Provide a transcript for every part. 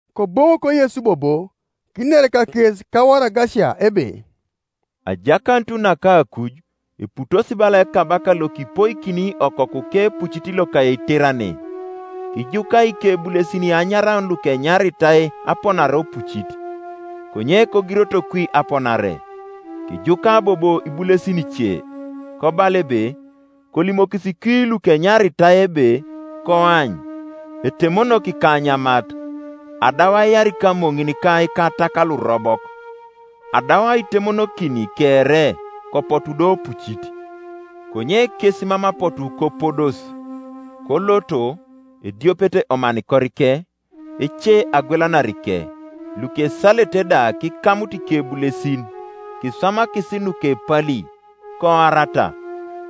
Koboŋok Yesu bobo, kiner kakes kawaragasia ebe, “Ajakanut naka akuj eputos bala ekabaka lokipoikini okokuke epucit loka eiterane. Kijuka ikebulesin anyaraun lukenyaritai aponare opucit; konye kogiroto kwi aponare. Kijuka bobo ibulesin ice, kobala ebe, ‘Kolimokis kwi lukenyaritai ebe, Koany, etemonok ikanyamat, adau aiar ikamoŋin ka ikatak lurobok, adau aitemonokin kere; kopotu do opucit.’ Konye kes mam apotu kopodos, koloto, ediopet omanikorike, ece agwelanarike, lukesalete da kikamut ikebulesin, kiswamakis nukepali, koarata.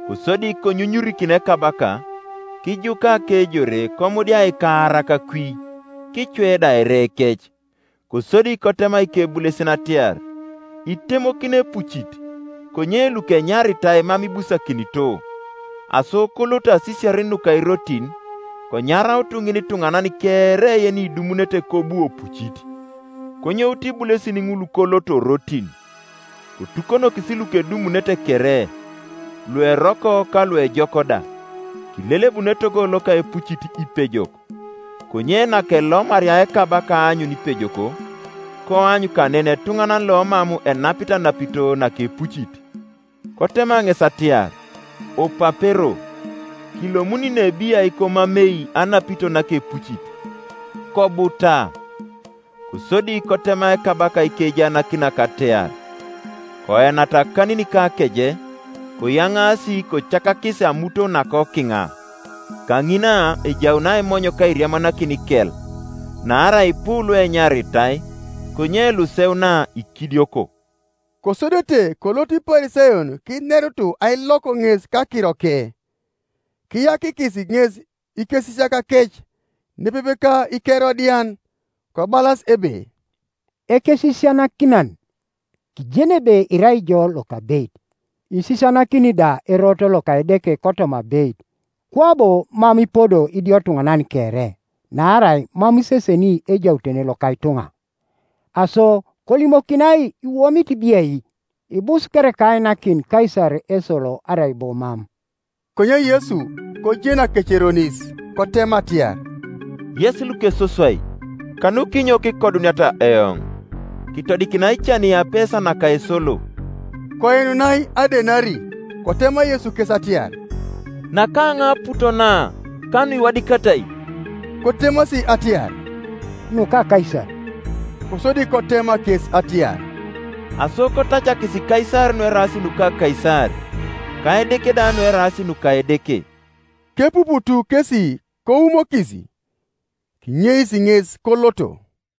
Kosodi konyunyurikin ekabaka, kijuka akejore komudia ikaarak kwi, kicwe da erekec, Kosodi kotema ikebulesin atiar, ‘Itemokino epucit, konye lukenyaritai mam ibusakinito. Aso koloto asisiarin nuka irotin, konyarautu ŋinituŋanan kere yenidumunete kobu opucit.’ Konyoutu ibulesin ŋul koloto orotin, kotukonokis lukedumunete kere, lueroko ka luejok da; kilelebun etogo loka epucit ipejok. Konye nakelomaria ekabaka aanyun ipejok, koany kanen etuŋanan lomam enapit anapito nakepucit. Kotema ŋes atiar, ‘Opapero, kilomuni ne biai komamei anapito nakepucit?’ Kobuta. Kosodi kotema ekabaka ikejaanakinak atiar, ‘Koenata akanin ka akeje, koyaŋaasi kocakakis amuton nakokiŋa; kaŋina ejaun aimony ka airiamanakin ikel.’ Naarai ipu luenyaritai, konye luseuna ikidioko.” Kosodete koloto Iparisayon kinerut ailok ŋes kakiroke. Kiyakikis ŋes ikesisiakakec, nepepe ka Ikerodian, kobalas ebe, “Ekesisianakinan, kijeni ebe irai ijo lokabeit, isisianakini da erot loka Edeke kotoma abeit, kwabo mam ipodo idiotuŋanan kere; naarai mam iseseni ejautene loka ituŋa. Aso kolimokinai iwomit biai? Ibus kereka ainakin Kaisar esolo, arai bo mam?” Konye Yesu kojen akeceronis, kotema atiar, “Yes lukesoswai, kanukinyo kikoduniata eoŋ? Kitodikinai cani apesa naka esolo.” Koinunai adenari. Kotema Yesu kes atiar, “Nakaŋai aput na, ka nuiwadikatai?” Kotemasi atiar, “Nuka Kaisar.” Kosodi kotema kes atiar, “Aso kotacakis Kaisar nueraas nuka Kaisar, ka Edeke da nueraas nuka Edeke.” Kepuputu kesi koumokis; kinyeis ŋes koloto.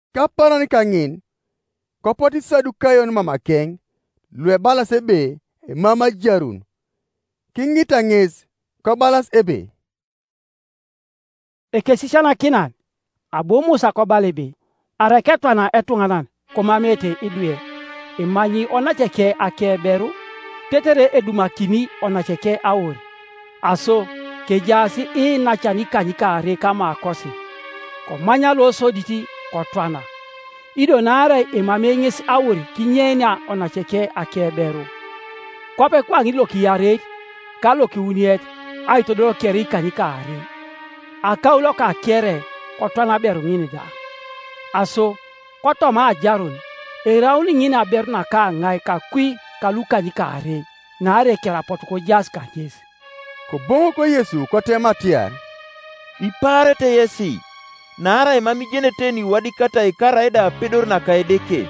Kapaaran kaŋin kopotu Isadukayon mamakeŋ, luebalas ebe emamei ajarun; kiŋita ŋes, kobalas ebe, “Ekesisianakinan, abu Musa kobala ebe, ‘Arai ketwana etuŋanan, komameete idwe, emanyi onaceke akeberu, tetere edumakini onaceke aur.’ Aso, kejaas iinacan ikanykaarei kamakosi; komany losodit, kotwana, ido naarai emamei ŋes aur kinyeinia onaceke akeberu; kwape kwaŋin lokiareit, ka lokiwuniet, aitodol kere ikanykaarei. Akaulo kakere, kotwana aberu ŋin da. Aso, kotoma ajarun, eraun ŋin aberu naka ŋai kakwi kalukanykaarei? Naarai kere apotu kojaas kaŋes.” Koboŋok Yesu kotema atiar, “Ipaarete yesi, naarai mam ijenete nuiwadikatai karaida apedor naka Edeke.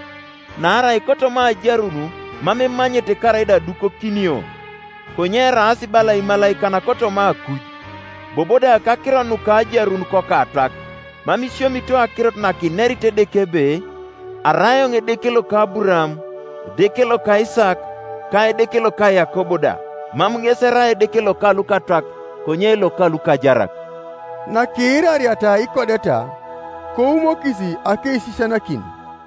Naarai kotoma ajarun mam emanyete karaida adukokinio, konye eraas bala imalaikan kotoma akuj. Bobo da kakiro nuka ajarun kokatwak, mam isiomito akirot nakinerit Edeke ebe, ‘Arai eoŋ Edeke loka Aburaam, Edeke loka Isaak, ka Edeke loka Yakob da’? Mam ŋes erai Edeke loka lukatwak, konye loka lukajarak.” Nakiirariata ikodeta, koumokis akeisisianakin.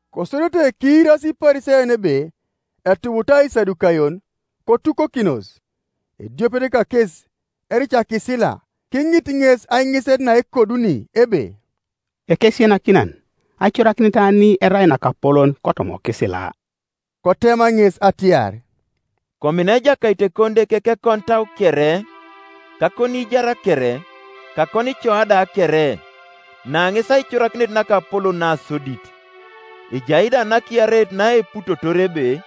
Kosodete kiirasi Iparisayon ebe etubuta Isadukayon, kotukokinos. Ediopet kakes, ericakisila, kiŋit ŋes aiŋiset naekoduni, ebe, “Ekesisianakinan, aicorakinet ani erai nakapolon kotoma okisila?” Kotema ŋes atiar, “Komina Ejakait Ekonideke kekonitau kere, ka akoniijar kere, ka akonicoa da kere. Na ŋes aicorakinet nakapolon nasodit. Ejai da nakiareit naeputotor ebe,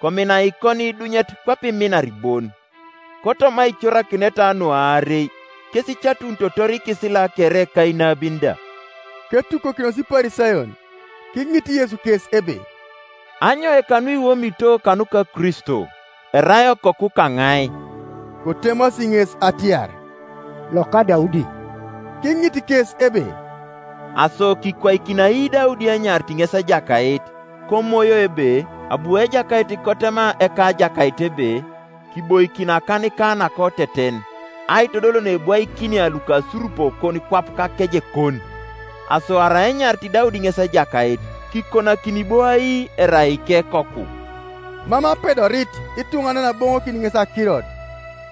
Komina ikoniidunyet kwape iminar bon. Kotoma aicorakineta nu aarei kes icatunitotor ikisila kere ka inabin da.” Ketukokinos Iparisayon, kiŋit Yesu kes ebe, “Anyoika nuiwomito kanuka Kristo? Erai Okoku kaŋai?” Kotemasi ŋes atiar, “Loka Daudi.” Kiŋit kes ebe, “Aso kikwaikini ai Daudi enyarit ŋes Ejakait, koMoyo ebe, ‘Abu Ejakait kotema Ekajakait ebe, Kiboikin akanika nakoteten, Aitodol neebwaikinia lukasurupokon kwap kakejekon’? Aso arai enyarit Daudi ŋes Ejakait, kikonakini bo ai erai ikekoku.” Mam apedorit ituŋanan aboŋokin ŋes akirot,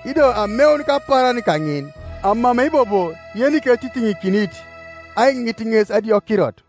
ido ameun kapaaran kaŋin amamei bobo yeniketitiŋikinit aiŋit ŋes adiokirot.